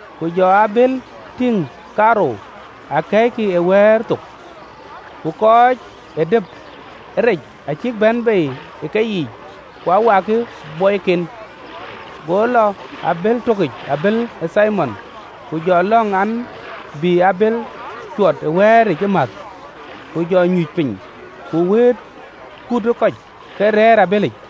Ku jɔ abëël tïŋ kaarou, akɛ̈ɛ̈ckï ë wɛ̈ɛ̈r thok, ku kɔc ee dep ë rec acïk bɛ̈n bei ë keyiic, ku wakkï bɔɔiken. Go lɔ ë abël tökic, abël ë Thimon, ku jɔ lɔ̈ŋ an, bï abël cuɔt ë wɛ̈ɛ̈ric ëmääth, ku jɔ nyuc piny, ku wëët kut ë kɔc ke rɛ̈ɛ̈r ë abëlic.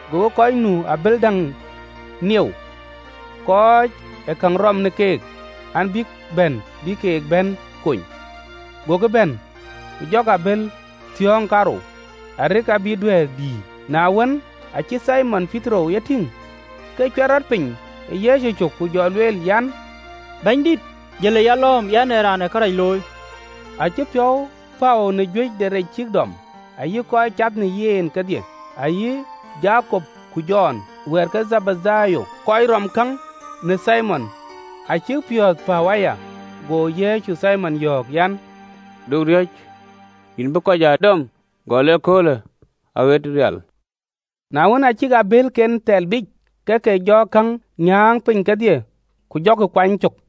Gokï kɔc nu ë abël däŋic nieu, kɔc ee käŋ rɔ̈ɔ̈m në keek an, bïk bɛ̈n, bïk ke bɛ̈n kony. Gokï bɛ̈n, ku jɔkï abëël thiɔ̈ɔ̈ŋ kaarou, arëk abïk duɛ̈ɛ̈r dïïr. Na wën, aacï Thimon Petero ye tïŋ, ke cuɛt rɔt piny ë Yecu cök, ku jɔ lueel an, “Bɛ̈nydït, jël ë yalɔ̈ɔ̈m, yɛn ee raan ee kërac looi!” Acï piɔ̈u päu në juëc de rec cïk dɔm, ayï kɔc cath në yen kedhie. Ayï Jakop ku Jɔn, wɛ̈ɛ̈t ke Dhebedayo, kɔc rööm käŋ në Thimon, acïk piɔ̈ɔ̈th päu aya. Go Yecu Thimon yɔ̈ɔ̈k an, “Du riɔ̈c, yïn bï kɔc aa dɔm, gɔl ëköölë aɣët rial.” Na wën, aa cïk abëëlken thɛl biic, ke ke jɔ käŋ nyääŋ piny kedhie, ku jɔkï kuany cök.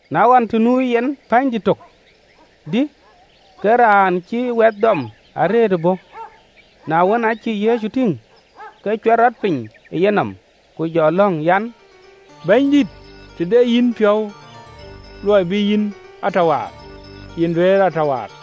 Na ɣɔn, të nu yen pänydït tök, dï, ke raan cïï wɛth dɔm arëët ë bɔ̈, na wën, aa cï Yecu tïŋ, ke cuɛt rɔt piny ë yenɔm, ku jɔ lɔ̈ŋ an, “Bɛ̈nydït, të de yïn piɔ̈u luɔi bï yïn a tɔ waar, yïn duëër a tɔ waar!”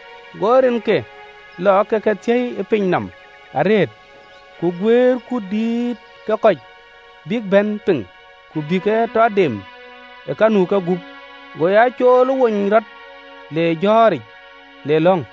Go rinke lɔ ke ke thiëi ë piny nɔm arëët: ku guëër kuut dïït ë kɔc bïk bɛ̈n piŋ, ku bï ke tɔ dem ë ka nu ë kegup. Go ya cool ë wony rɔt le jɔ̈ɔ̈ric le lɔ̈ŋ.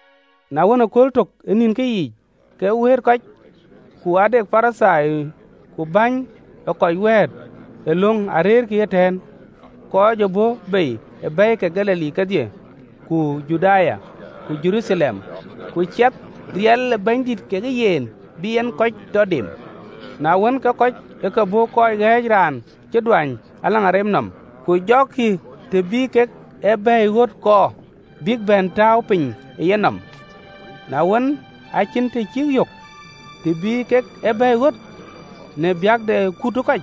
Na wën, ëkööl tök ë nïnkë yiic, ke wëët kɔc, ku ade Parithai ku bäny ee kɔc wɛ̈ɛ̈t ë löŋ arëërkï ëtɛ̈ɛ̈n, kɔc ë bɔ̈ bei ë bɛ̈i ke Galili kedhie, ku Juda, ku Jeruthalem. Ku cath riɛl ë Bɛ̈nydït kekë yen, bï en kɔc tɔ dem. Na wën, ke kɔc ë ke bɔ̈ kɔc ɣɛ̈ɛ̈c raan cï duany në agen nɔm: ku jɔkï të bï kek ë bɛ̈ɛ̈i ɣöt kɔɔr, bïk bɛ̈n tääu piny ë yenɔm. Na wën, acïn të cïk yök, të bï kek ë bɛ̈ɛ̈i ɣöt, në biäk de kut ë kɔc,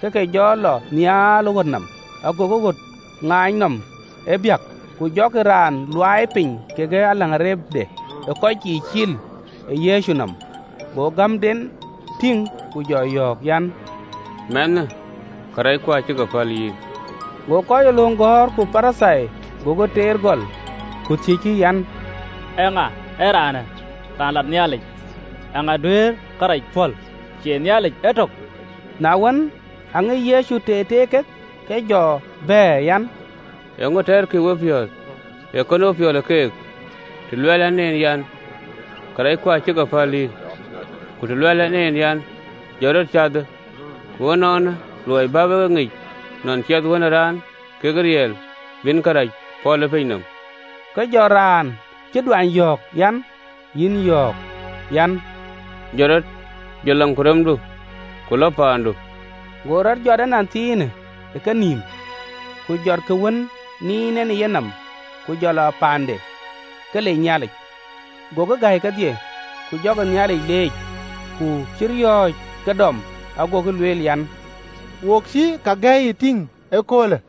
ke ke jɔ lɔ nhial ë ɣöt nɔm, agokï ɣöt ŋaany nɔm ë biäk, ku jɔkï raan luaai piny kekë agende ë kɔc yiic cil ë Yecu nɔm. Go gämden tïŋ, ku jɔ yɔ̈ɔ̈k an, “Mɛnhë, karɛcku acï ke päl yïn.” Go kɔc ee löŋ gɔ̈ɔ̈r ku Parithai gokï teer gɔl, ku thiëckï an, “Eeŋa yen raanë raan lat Nhialic! Eeŋa duëër kërac pɔ̈l, cie Nhialic Etök!” Na wën, ke Yecu ŋic teer teer kek, ku jɔ bɛ̈ɛ̈r an, “Eeŋö tɛɛrkï ë wepiɔ̈ɔ̈th? Ee kënou piɔl ë keek, të luɛɛl ɛn en an, ‘Karɛcku acï ke päl yïn,’ ku të luɛɛl ɛn en an, ‘Jɔt rɔt, ku cathë?” Ku ënɔɔnë, luɔi bä wek e ŋic, nɔn ciɛth ë Wën ë Raan ke riɛl bï en karɛc pɔ̈l ë piny nɔm, ke jɔ raan cï duany yɔ̈ɔ̈k an, “Yïn yɔ̈ɔ̈k an, Jɔt rɔt, jɔt agendu, ku lɔ paandu!” Go rɔt jɔt ënɔnthiinë ë kenïïm, ku jɔt kë wën niin en ë yenɔm, ku jɔ lɔ paande, ke lec Nhialic. Gokï gäi kedhie, ku jɔkï Nhialic leec, ku cï riɔ̈ɔ̈c ke dɔm, agokï lueel an, “Wo cï kake gäi tïŋ ee köölë!”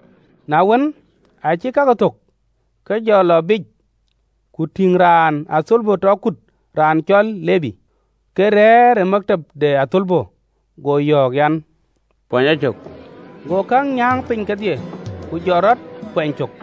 Na wën, aacï kakë thök, ke jɔ lɔ biic, ku tïŋ raan ë athölbö tɔ kut, raan cɔl Lebi, ke rɛ̈ɛ̈r tëdɛn ë luɔi de athölbö yic: go yɔ̈ɔ̈k an, “Kuany a cök.” Go käŋ nyääŋ piny kedhie, ku jɔt rɔt, kuɛny cök.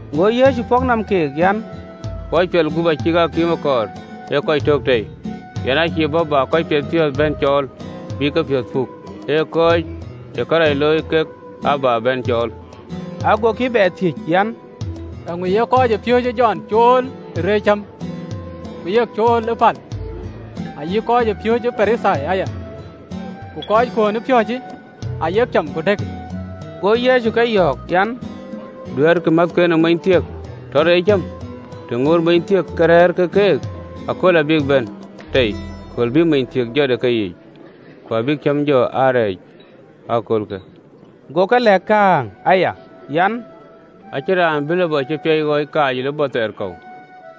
Go Yecu pɔ̈k nɔm keek an, “Kɔc piɔl gup acïkï akïïm ee kɔɔr, ee kɔc tök tei. Yɛn ë cïï bɔ̈ bä kɔc piɛthpiɔ̈ɔ̈th bɛ̈n cɔɔl, bïk kepiɔ̈ɔ̈th puk, ee kɔc ë kërac looi kek aa bä bɛ̈n cɔɔl.” Agokï bɛ thiëëc an, “Eeŋö ye kɔc ë piööcë Jɔn cool ë reec cäm, ku yek cool ë pal, ayï kɔc ë piööcë Parithai aya, ku kɔckuön ë piööcë ayek cam ku dëkkï.” Go Yecu ke yɔ̈ɔ̈k an, “Duɛ̈ɛ̈rkï määthken ë mony thiëk tɔ reec cäm, të ŋootë monythiëk ke rɛ̈ɛ̈r ke keek? Akööl abïk bɛ̈n tei, kööl bï monythiëk jɔt ë keyiic, ku abïk cäm jɔ rɛɛc ee köölë.” Go ke lɛ̈k kääŋ aya an, “Acïn raan bï lupɔ cï piac ɣɔɔc kaac ë lupɔ thɛɛr kɔ̈u,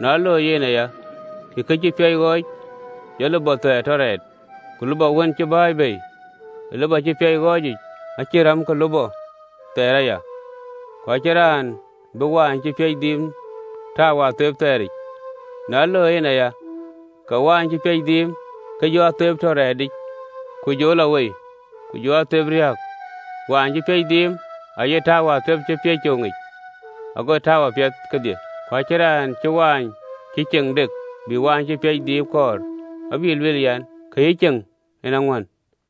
na loi yen aya, ke kë cï piac ɣɔɔc jɔ lupɔ thɛɛr tɔ rɛɛt, ku lupɔ wën cï bɛ̈ɛ̈i bei ë lupɔ cï piac ɣɔɔc yic acïï räm ke lupɔ thɛɛr aya. Ku acïn raan bï mɔ̈n cï piac dhiim tääu ë atheep thɛɛr yiic, na loi en aya, ke mɔ̈n cï piac dhiim ke jɔ atheep tɔ rɛɛt yiic, ku jɔ lɔ wei, ku jɔ atheep riääk. Mɔ̈n cï piac dhiim aye tääu ë atheep cï piac coŋ yiic, agokï tɔ̈u apiɛth kedhie. Ku acïn raan cï mɔ̈n cï ceŋ dek bï mɔ̈n cï piac dhiim dap kɔɔr: abï lueel, an, ‘Kë cï ceŋ en aŋuän.’”